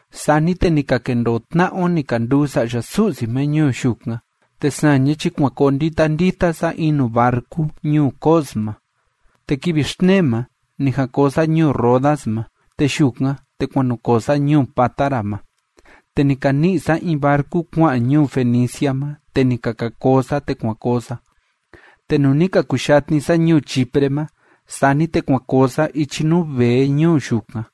Sani te ni ka kendoo tna'a o ni ka nduu sa'ya Su'si ma ñuu yukan, te saña chi kuan koo ndita ndita sa in nuu barcu ñuu Cos ma. Te kivi xtnee ma ni jan koo sa ñuu Rodas ma, te yukan, te kuan nu koo sa ñuu Pátara ma. Te ni ka ni'i sa in barcu kua'an ñuu Fenicia ma, te ni ka ka koo sa, te kuan koo sa. Te nuu ni ka kuyatni sa ñuu Chipre ma, sani te kuan koo sa ichi nuu vee ñuu yukan.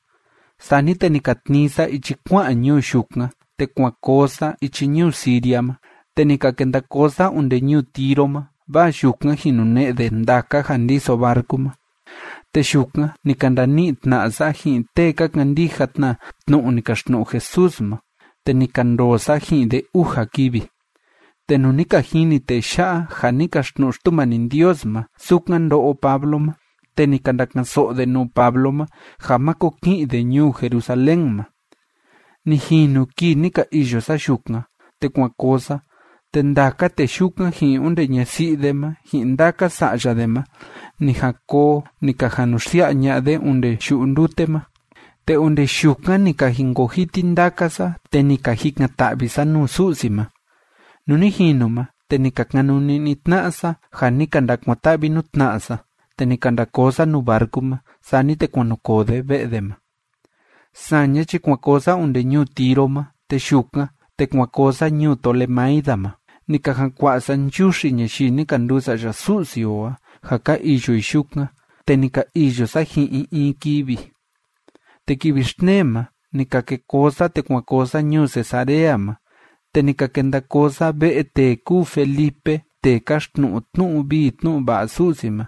Sani te ni ka tnii sa ichi kua'an ñuu yukan, te kuan koo sa ichi ñuu Siria ma, te ni ka kenda koo sa onde ñuu Tiro ma, vaa yukan jin nune'e de ndaka ja ndiso barcu ma. Te yukan ni ka ndani'i tna'a sa ji'in tee ka kandija tna tnu'u ni kaxtnu'u Jesús ma, te ni ka ndoo sa ji'in de uja kivi. Te nuu ni ka jini tee ya'a ja ni kaxtnu'u Xtumani Ndios ma sukan ndo'o Pablo ma, te ni ka ndaka'an‑so'o de nuu Pablo ma ja máko ki'in de ñuu Jerusalén ma. Ni jinu kii ni ka iyo sa yukan, te kuan koo sa, te ndaka tee yukan, ji'in onde ñasi'i de ma, ji'in ndaka sa'ya de ma ni jan koo ni ka jan nu xsia'a ña'a de onde yu'u ndute ma, te onde yukan ni ka jinkoo jiti ndaka sa, te ni ka jikan‑ta'vi sa nuu Su'si ma. Nuu ni jinu ma, te ni ka kanuni'ni tna'a sa ja ni ka ndakuan‑ta'vi nuu tna'a sa, te ni ka nda koo sa nuu barcu ma, sani te kuan nu koo de ve'e de ma. Saña chi kuan koo sa onde ñuu Tiro ma, te yukan, te kuan koo sa ñuu Tolemaida ma, ni ka jan kua'a sa nchuxi ñayii ni ka nduu sa'ya Su'si o a ja ka iyo i yukan, te ni ka iyo sa ji'in i in kivi. Te kivi xtnee ma, ni ka ke koo sa, te kuan koo sa ñuu Cesarea ma, te ni ka kenda koo sa ve'e tee kúu Felipe tee káxtnu'u tnu'u vii tnu'u va'a Su'si ma.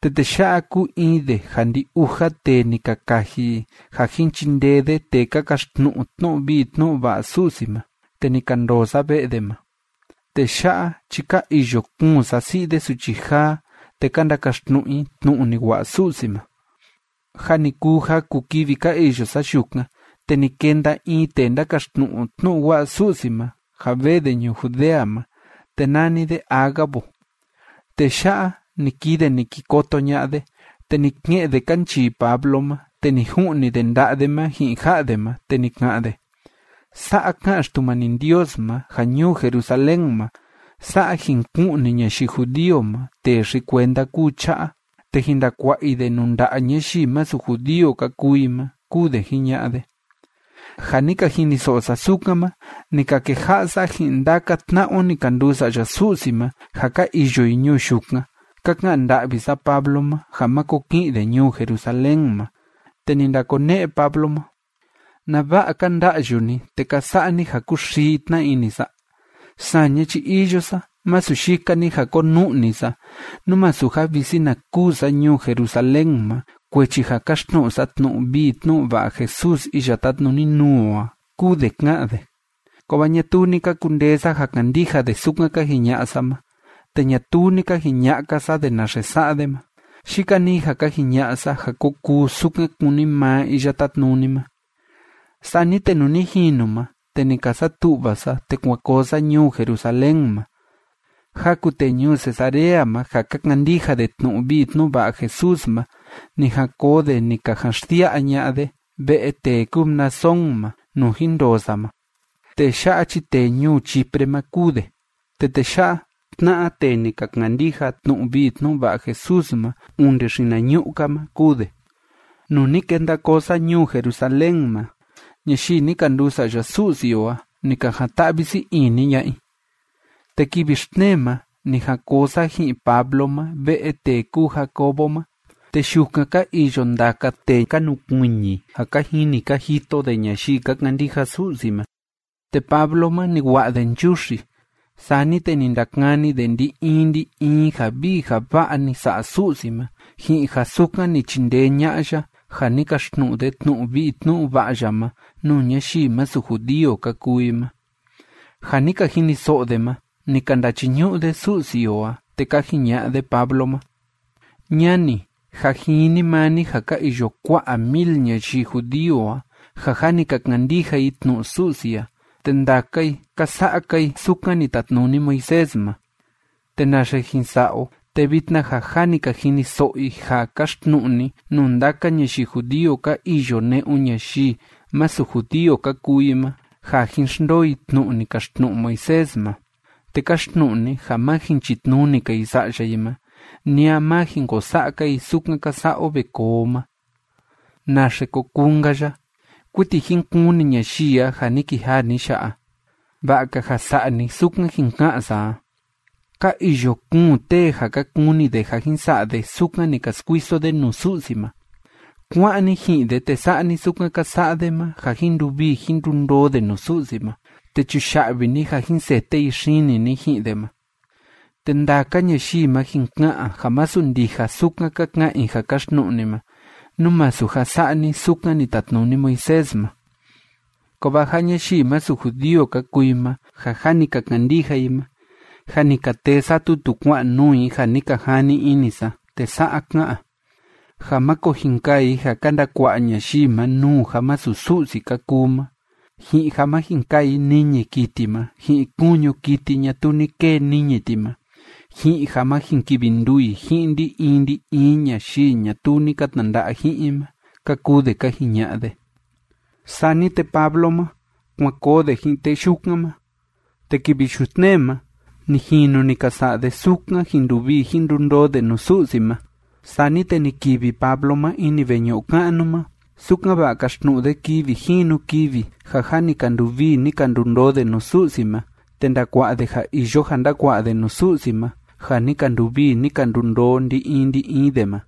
Te tee ya'a kúu in de ja ndi‑uja tee ni ka kaji i ja jin chindee de tee ka kaxtnu'u tnu'u vii tnu'u va'a Su'si ma, te ni ka ndoo sa ve'e de ma. Tee ya'a chi ka iyo kuun sasi'i de suchi jaa, te ka ndakaxtnu'u i tnu'u ni wa'a Su'si ma. Jâ ni kuu jaku kivi ka iyo sa yukan, te ni kenda in tee ndákaxtnu'u tnu'u wa'a Su'si ma, ja vee de ñuu Judea ma, te nani de Ágabo. Tee ya'a, ni kii de ni ki koto ña'a de, te ni ke'en de kanchii Pablo ma, te ni ju'ni de nda'a de ma ji'in ja'a de ma, te ni ka'an de: ―Sa'a ká'an Xtumani Ndios ma, ja ñuu Jerusalén ma, sa'a jin ku'ni ñayii judío ma tee xi‑kuenda kúu cha'a, te jin ndakua'a i de nuu nda'a ñayii masu judío ka kuu i ma ―kúu de jiña'a de. Ja ni ka jiniso'o sa sukan ma, ni ka keja'a sa ji'in ndaka tna'a o ni ka nduu sa'ya Su'si ma ja ka iyo i ñuu yukan ka ka'an nda'vi sa Pablo ma ja máko ki'in de ñuu Jerusalén ma. Te ni ndakone'e Pablo ma: ―¿Nava'a ka nda'yu ni te ka sa'a ni ja kuxii tna ini sa? Saña chi iyo sa masu yika‑ni ja konu'ni sa, nú masu ja visi na kûu sa ñuu Jerusalén ma, kuechi ja káxtnu'u sa tnu'u vii tnu'u va'a Jesús iya tátnuni nuu o a ―kúu de ká'an de. Kovaa ñatuu ni ka kundee sa ja kandija de sukan ka jiña'a sa ma, te ñatuu ni ka jiña'a‑ka sa de naxe sa'a de ma. Yika‑ni ja ka jiña'a sa ja ko kuu sukan kúni maa Iya Tátnuni ma. Sani te nuu ni jinu ma, te ni ka satu'va sa, te kuan koo sa ñuu Jerusalén ma. Jaku tee ñuu Cesarea ma ja ka kandija de tnu'u vii tnu'u va'a Jesús ma, ni jan koo de ni ka jan xsia'a ña'a de ve'e tee kúu Mnasón ma, nuu jin ndoo sa ma. Tee ya'a chi tee ñuu Chipre ma kúu de. Te tee ya'a, tna'a tee ni ka kandija tnu'u vii tnu'u va'a Jesús ma onde xinañu'u‑ka ma kúu de. Nuu ni kenda koo sa ñuu Jerusalén ma, ñayii ni ka nduu sa'ya Su'si o a, ni ka jan‑ta'vi sii ini ña'a i. Te kivi xtnee ma, ni jan koo sa ji'in Pablo ma ve'e tee kúu Jacobo ma, te yukan ka iyo ndaka tee ka nukuiñi ja ka jini ka jito de ñayii ka kandija Su'si ma. Te Pablo ma, ni wa'a de nchuxi. Sani te ni ndakani de ndi‑in ndi‑in ja vii ja va'a ni sa'a Su'si ma ji'in ja sukan ni chindee ña'a ya ja ni kaxtnu'u de tnu'u vii tnu'u va'a ya ma nuu ñayii masu judío ka kuu i ma. Ja ni ka jiniso'o de ma, ni ka ndachiñu'u de Su'si o a, te ka jiña'a de Pablo ma: ―Ñani, jâ jini maa ni ja ka iyo kua'a mil ñayii judío a ja jâ ni ka kandija i tnu'u Su'si a, te ndaka i, ka sa'a‑ka i sukan ni tatnuni Moisés ma. Te naxe jin sa'a o, te vitna ja jâ ni ka jiniso'o i ja káxtnu'u ni nuu ndaka ñayii judío ka iyo ne'un ñayii masu judío ka kuu i ma, ja jín xndoo i tnu'u ni kaxtnu'u Moisés ma, te káxtnu'u ni ja má jin chitnuni‑ka i sa'ya i ma, ni a má jin ko sa'a‑ka i sukan ka sa'a o ve koo o ma. ¿Naxe ko kuu‑nka ya? Kuiti jin kuni ñayii a ja ni kijaa ni ya'a. Va'a‑ka ja sa'a ni sukan jin ka'an sa a. Ka iyo kuun tee ja ka kuni de ja jin sa'a de sukan ni ka skuiso de nuu Su'si ma. Kuá'an ni ji'in de, te sa'a ni sukan ka sa'a de ma, ja jin nduvii jin ndundoo de nuu Su'si ma, te chuya'vi ni ja jin sete i xini ni ji'in de ma. Te ndaka ñayii ma jin ka'an ja masu ndija sukan ka ka'an i ja káxtnu'u ni ma, nú masu ja sa'a ni sukan ni tatnuni Moisés ma. Kovaa ja ñayii masu judío ka kuu i ma ja jâ ni ka kandija i ma, jâ ni ka tee sa tutu kua'an nuu i ja ni ka jani ini sa, te sa'a ká'an: ja máko jin kaa i ja ka ndakua'a ñayii ma nuu ja masu Su'si ka kuu ma, ji'in ja ma jin kaa i niñi kiti ma ji'in kuñu kiti ñatuu ni kee niñi ti ma, ji'in ja ma jin kivi nduu i ji'in ndi‑in ndi‑in ñayii ñatuu ni ka tnanda'a ji'in i ma ―ka kuu de ka jiña'a de. Sani te Pablo ma, kuan koo de ji'in tee yukan ma, te kivi yutnee ma ni jinu ni ka sa'a de sukan jin nduvii jin ndundoo de nuu Su'si ma, sani te ni kivi Pablo ma ini veñu'u ka'nu ma, sukan‑va'a kaxtnu'u de kivi jinu kivi ja jâ ni ka nduvii ni ka ndundoo de nuu Su'si ma te ndakua'a de ja iyo ja ndukua'a de nuu Su'si ma ja ni ka nduvii ni ka ndundoo ndi‑in ndi‑in de ma.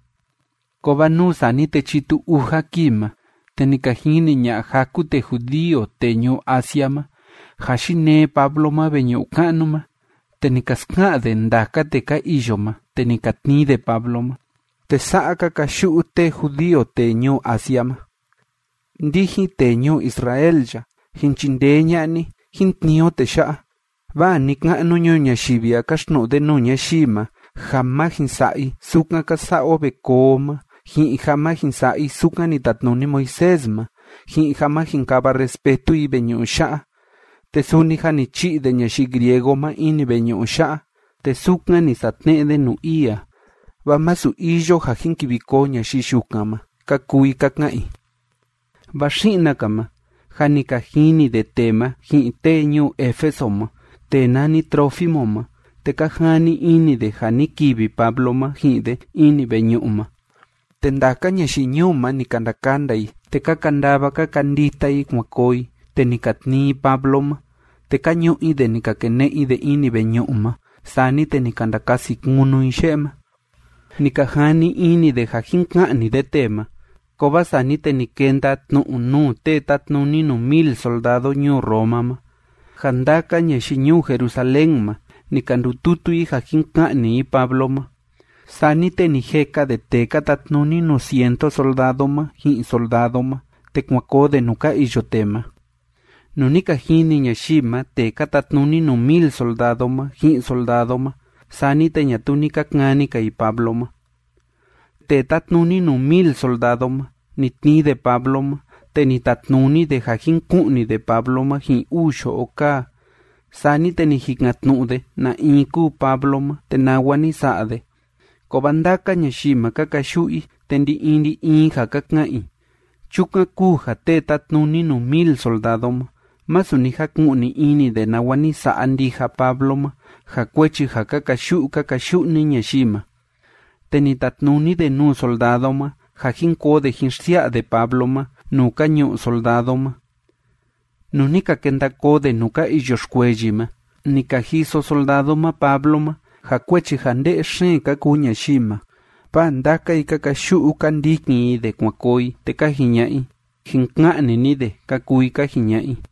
Kovaa nuu sani te chitu uja kii ma, te ni ka jini ña'a jaku tee judío tee ñuu Asia ma, ja yinee Pablo ma veñu'u ka'nu ma, te ni ka ska'an de ndaka tee ka iyo ma, te ni ka tnii de Pablo ma, te sa'a ka kayu'u tee judío tee ñuu Asia ma: ―Ndijin, tee ñuu Israel ya, ¡jin chindee ña'a ni, jín tnii o tee ya'a! Vaa ni‑ka'nu ñuu ñayivi a káxtnu'u de nuu ñayii ma ja má jin sa'a i sukan ka sa'a o ve koo o ma, ji'in ja má jin sa'a i sukan ni tatnuni Moisés ma, ji'in ja má jin kava respetu i veñu'u ya'a. Te suni jâ ni chi'i de ñayii griego ma ini veñu'u ya'a, te sukan ni satne'e de nuu ii a, vaa masu iyo ja jin kivi koo ñayii yukan ma ―ka kuu i ka ka'an i. Vaa xi'na‑ka ma, jâ ni ka jini de tee ma ji'in tee ñuu Éfeso ma tee nani Trófimo ma, te ka jani ini de ja ni kivi Pablo ma ji'in de ini veñu'u ma. Te ndaka ñayii ñuu ma, ni ka ndakanda i. Te ka kandava ka kandita i kuan koo i, te ni ka tnii i Pablo ma, te ka ñu'u i de ni ka kene'e i de ini veñu'u ma. Sani te ni ka ndakasi kunu i ye'e ma. Ni ka jani ini de ja jin ka'ni de tee ma, kovaa sani te ni kenda tnu'u nuu tee tátnuni nuu mil soldado ñuu Roma ma, ja ndaka ñayii ñuu Jerusalén ma, ni ka ndututu i ja jin ka'ni i Pablo ma. Sani te ni jeka de tee ka tatnuni nuu cientu soldado ma ji'in soldado ma, te kuan koo de nuu ka iyo tee ma. Nuu ni ka jini ñayii ma tee ka tatnuni nuu mil soldado ma ji'in soldado ma, sani te ñatuu ni ka kani‑ka i Pablo ma. Tee tátnuni nuu mil soldado ma, ni tnii de Pablo ma, te ni tatnuni de ja jin ku'ni de Pablo ma ji'in uu yo'o kaa. Sani te ni jikan‑tnu'u de na in kúu Pablo ma te nawa ni sa'a de. Kovaa ndaka ñayii ma, ka kayu'u i, te ndi‑in ndi‑in ja ka ka'an i, chukan kúu ja tee tátnuni nuu mil soldado ma, masu ni jaku'ni ini de nawa ni sa'a ndija Pablo ma, ja kuechi ja ka kayu'u ka kayu'u‑ni ñayii ma. Te ni tatnuni de nuu soldado ma ja jín koo de jín xsia'a de Pablo ma nuu ka ñu'u soldado ma. Nuu ni ka kenda koo de nuu ka iyo xkueyi ma, ni ka jiso soldado ma Pablo ma, ja kuechi ja nde'e xeen ka kuu ñayii ma, vaa ndaka i ka kayu'u, ka ndikin i de kuan koo i, te ka jiña'a i: ―Jin ka'ni ni de ―ka kuu i ka jiña'a i.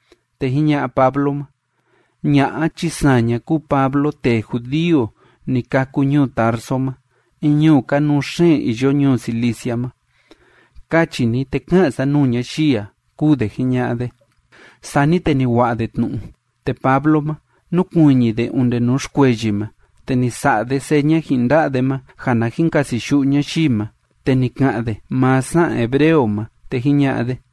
Te jiña'a Pablo ma: ―Ña'a chi saña kúu Pablo tee judío ni kâku ñuu Tarso ma in ñuu kanuu xeen iyo ñuu Cilicia ma. Kachi ni, te ka'an sa nuu ñayii a ―kúu de jiña'a de. Sani te ni wa'a de tnu'u. Te Pablo ma, núkuiñi de onde nuu xkueyi ma, te ni sa'a de seña ji'in nda'a de ma ja na jin kasiyu'u ñayii ma, te ni ka'an de maa sa'an hebreo ma, te jiña'a de: